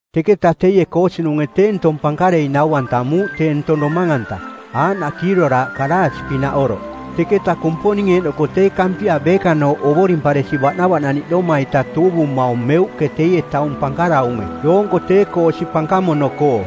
Teketa teie koosinunge tee ntong pankarei nau-antamuuꞌ tee ntong domang-anta, aaꞌnaꞌ kiiroraaꞌ kalaasi-pinaꞌ oroꞌ, teketa Kumponing eeꞌnoko tee Kampia beekanooꞌ ovorimparesi baꞌnavaꞌnaniꞌdoma-ita tuuvumaung meuꞌke teie taung pankaraunge doonko tee-koo osi pankamono-koo.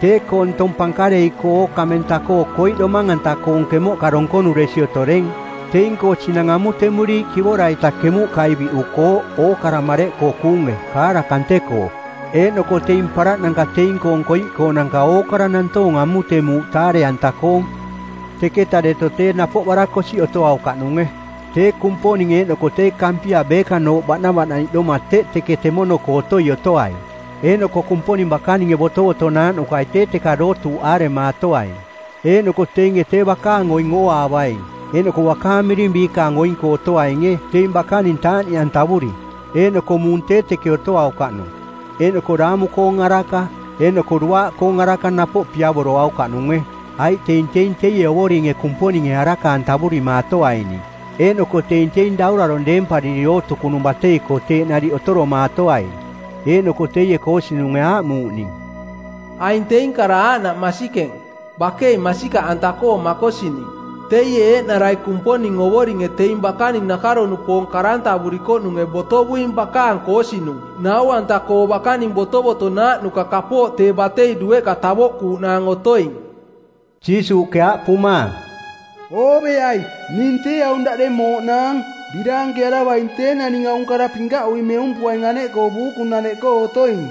Tee-koo ntong pankarei-koo ookamenta-koo koiꞌ domang-anta-koong kemoꞌka donkonuresi otoreng, teing-koo sinang amutemuriiꞌ kivora-ita kemuꞌkai biꞌukooꞌ ookara mareꞌkoo kuunge kaara kante-koo. Eeꞌnoko teing paraꞌnanka teing-koong koiꞌkoonanka ookara nantoong amutemuuꞌ taare-anta-koong. Teketa deto tee napoꞌ barakosiꞌ otoaukaꞌnunge, tee Kumponing eeꞌnoko tee Kampia beekanooꞌ baꞌnavaꞌnaniꞌdoma teꞌ teke temono-koo otoi otoaing eeꞌnoko Kumponing bakaninge botovotonaaꞌnukai tee teka dootuuꞌaaremaatoaing. Eeꞌnoko teinge tee bakaang oing ooaavaing eeꞌnoko bakaang miring biikaang oing-koo otoainge teing bakaning taaꞌniꞌantavuri. Eeꞌnoko muung tee teke otoaukaꞌnung, eeꞌnoko daamu-koong araka eeꞌnoko duaaꞌkoong araka napoꞌ piavoroaukaꞌnunge, aiꞌ teing teing teie Ovoringe Kumponinge araka-antavurimaatoaining. Eeꞌnoko teing teing daurarong deempariri ootukunung batei-koo teeꞌ nariꞌ otoromaatoaing. Eeꞌnoko teie koosinunge aaꞌmuuꞌ ning, “Aing teing kara aaꞌnaꞌ masikeng, bakei masikaꞌanta-koo makosining. Teie eeꞌnarai Kumponing Ovoringe teing bakaning nakaro-nupoong karantavurikoꞌnunge˜ botovuing bakaang koosinung nau-anta-koo bakaning botovotonaaꞌnuka kapooꞌ tee batei dueꞌka tavoꞌkuuꞌnaang otoing.” Jiisuuꞌke aaꞌpumaang, “Ooveai! Ning tee aung daꞌdeng mooꞌnaang. Biraankearavaing tee naning aung kara pinkaꞌui meumpuaing aneꞌkoo buukunaneꞌkoo otoing.”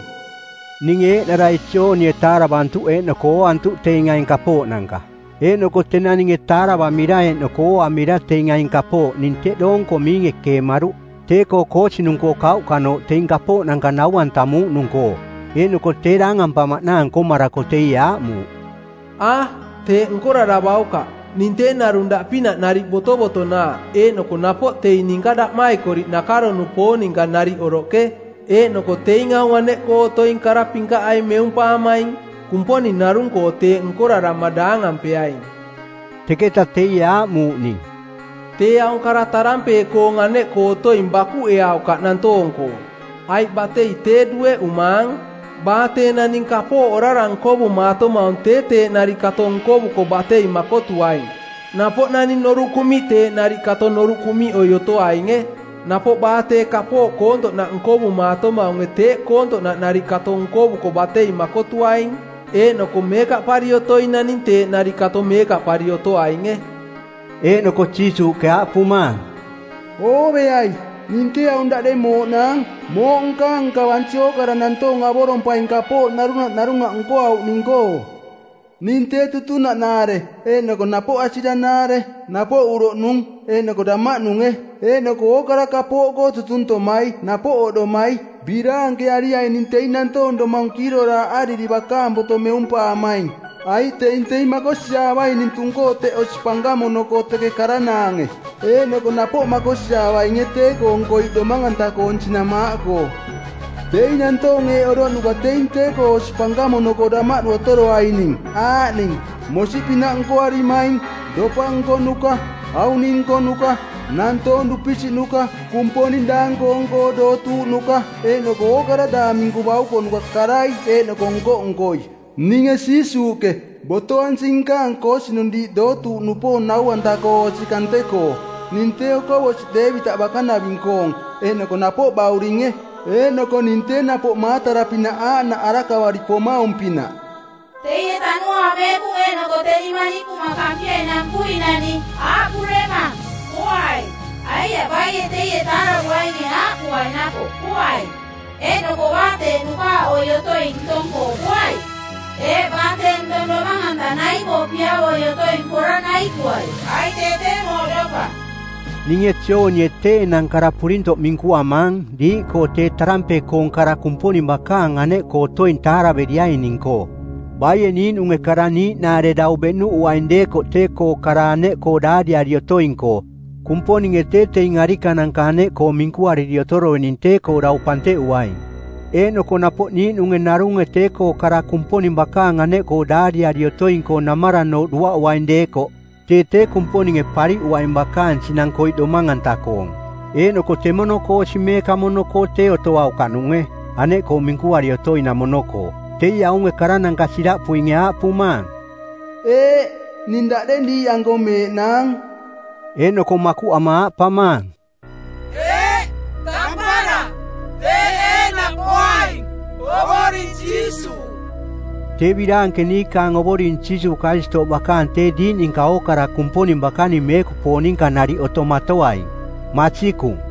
Ninge eeꞌnarai Joonie taaravantuꞌ eeꞌnoko ooantuꞌ teing aing kapooꞌnanka. Eeꞌnoko tenang ninge taaravamira eeꞌnoko ooamira teing aing kapooꞌ ning tee teꞌ doonko miinge keemaruꞌ tee-koo koosinung-koo kauꞌkanooꞌ teing kapooꞌnanka nau-antamuuꞌnung-koo. Eeꞌnoko tee daangampamaꞌnaang nkomarako teie aaꞌmuuꞌ, “A, teeꞌ nkoraravaukaꞌ. Ning tee narung daꞌpinaꞌ nariꞌ botovotonaaꞌ eeꞌnoko napoꞌ teing ninka daꞌmaikoriꞌ nakaro-nupoong ninka nariꞌ oroꞌke, eeꞌnoko teing aung aneꞌkoo otoing kara pinkaꞌai meumpaamaing. Kumponing narung-koo teeꞌ nkorarama daangampeaing.” Teketa teie aaꞌmuuꞌ ning, “Tee aung kara tarampee-koong˜ aneꞌkoo otoing bakuꞌeaukaꞌ nantoong-koo, aiꞌ batei tee dueꞌumaang. Baa tee naning kapooꞌ orara nkovumaatomaung tee teeꞌ nariꞌ kato nkovuko batei makotuaing, napoꞌ naning noruꞌ kuꞌmiꞌ teeꞌ nariꞌ kato noruꞌ kuꞌmiꞌoi otoainge. Napoꞌ baa tee kapooꞌ koontoꞌnaꞌ nkovumaa-tomaunge teeꞌ koontoꞌnaꞌ nariꞌ kato nkovuko batei makotuaing, eeꞌnoko meekaꞌpari otoing naning teeꞌ nariꞌ kato meekaꞌpari otoainge.” Eeꞌnoko Jiisuuꞌke aaꞌpumaang, “Ooveai, ning tee aung daꞌdeng mooꞌnaang, mooꞌ nkaang nkavansi ookara nantoong avorompaing kapooꞌ narunaꞌ narunaꞌ nkoauꞌning-koo. Ning tee tutunaꞌnaare eeꞌnoko napoꞌ asiranaare, napoꞌ uroꞌnung eeꞌnoko damaꞌnunge, eeꞌnoko ookara kapooꞌkoo tutuntomai napoꞌ oꞌdomai. Biraankeariaining teing nantoong domang kiiroraaꞌariri bakaang boto meumpaamaing, aiꞌ teing teing makosiaavaining tung-koo teꞌ osi pankamono-koo teke karanaange, eeꞌnoko napoꞌ makosiaavainge tee-koong koiꞌ domang-anta-koong sinang maaꞌkoo. Teing nantoong eeꞌ oroꞌnuka teing tee-koo osi pankamono-koo damaꞌdu otoroaining, aaꞌning: mosiꞌpinaꞌ nkoarimaing, dopa nkonuka, auning nkonuka, nantoong dupisiꞌnuka, kumponing daang-koong-koo dootuuꞌnuka, eeꞌnoko ookara daang minku baukonuka karai eeꞌnoko nko-nkoi. Ninge Jiisuuꞌke, botoansing nkaang koosinung diiꞌ dootuuꞌnupoong nau-anta-koo osi kante-koo. Ning tee Okovosiꞌ Deevitaꞌ bakanaving-koong eeꞌnoko napoꞌ Bauringe. Eeꞌnoko ning tee napoꞌ maatara pinaꞌ aaꞌnaꞌ arakavari pomaung-pinaꞌ.” Teie Tanuaang Meekunge eeꞌnoko teni Manikuma Kampiai Nampui-nani aaꞌpuremang, “Poai.” Aiaꞌ baie teie taaravuainge aaꞌpuai napoꞌ, “Poai.” Eeꞌnoko baa tee nukaaꞌoi otoing ntong-koo poai. Eeꞌ, baa tee ntong domang-anta nai-koo piavoi otoing pora naikuai, aiꞌ tee tee mooꞌdopa. Ninge Joonie tee enang kara purintoꞌ minkuamaang diiꞌkoo tee tarampee-koong kara Kumponing bakaang aneꞌkoo otoing taaraveriaining-koo. Baie niiꞌnunge kara niiꞌnaare dau beꞌnuꞌuaing deekoꞌ tee-koo kara aneꞌkoo daariari otoing-koo, Kumponinge tee teing arikananka aneꞌkoo minkuariri otoroining tee-koo dau panteꞌuaing. Eeꞌnoko napoꞌ niiꞌnunge narunge tee-koo kara Kumponing bakaang aneꞌkoo daariari otoing-koo namaranooꞌ duaꞌuaing deekoꞌ, tee tee Kumponinge pariꞌuaing bakaang sinang koiꞌ domang-anta-koong. Eeꞌnoko temono-koo osi meekamono-koo tee otoaukaꞌnunge, aneꞌkoo minkuari otoinamono-koo. Teie aung karananka siraꞌpuinge aaꞌpumaang, “Eeꞌ, ning daꞌdeng diiꞌanko meeꞌnaang.” Eeꞌnoko makuꞌama aaꞌpamaang, “Eeꞌ, tampara; teeꞌ eeꞌnaꞌ poaing, Ovoring Jiisuuꞌ.” Tee biraanke niikaang Ovoring Jiisuuꞌ Karistooꞌ bakaang tee diiꞌ ninka ookara Kumponing bakaning meekupoong ninka nariꞌ otomatoaing. Masikung.